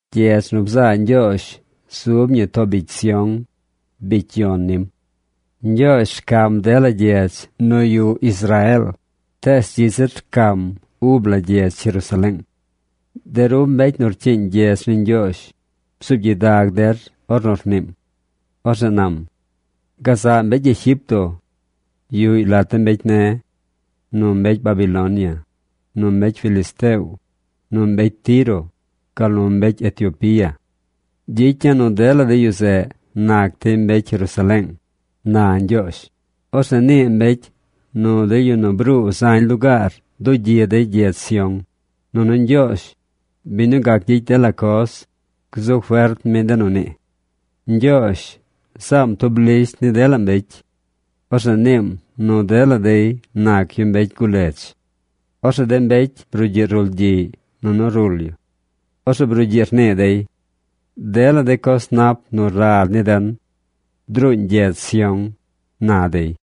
Gyedz nu bzaa Ñgyoozh zub ñi too bicy Sión, bicy yon nim. Ñgyoozh rcam dela gyedz nu yuꞌ Israeel, tees dzi zir rcam ub la gyedz Jerusaleeng. De ru mbecy nu rcyiiñ gyedz ni Ñgyoozh, bzuub gyidag der ornu rniim. Orzeꞌ nam: “Gazaꞌ mbecy Egipto yuꞌy lat de mbecy ne̱, nu mbecy Babilonia, nu mbecy Filisteo, nu mbecy Tiro, gal nu mbecy Etiopia. Gyicya̱ nu dela de yu zeꞌ nac dey mbecy Jerusaleeng”, na Ñgyoozh. Orzeꞌ nii mbecy nu de yu nu bruu zañ lugaar dugyi dey gyedz Sión, nunu Ñgyoozh, biñ nu gac gyicy dela coz, gzu fert mi de nu nii. Ñgyoozh zaam tub lisht ni dela mbecy. Orzeꞌ niim nu dela dey nac yu mbecy guledz. Orzeꞌ de mbecy brugyiꞌ rulgyiꞌy nunu rul yu. Orzeꞌ brugyiꞌ rnii dey: “Dela de coz nap nu rad ni den druuñ gyedz Sión”, na dey.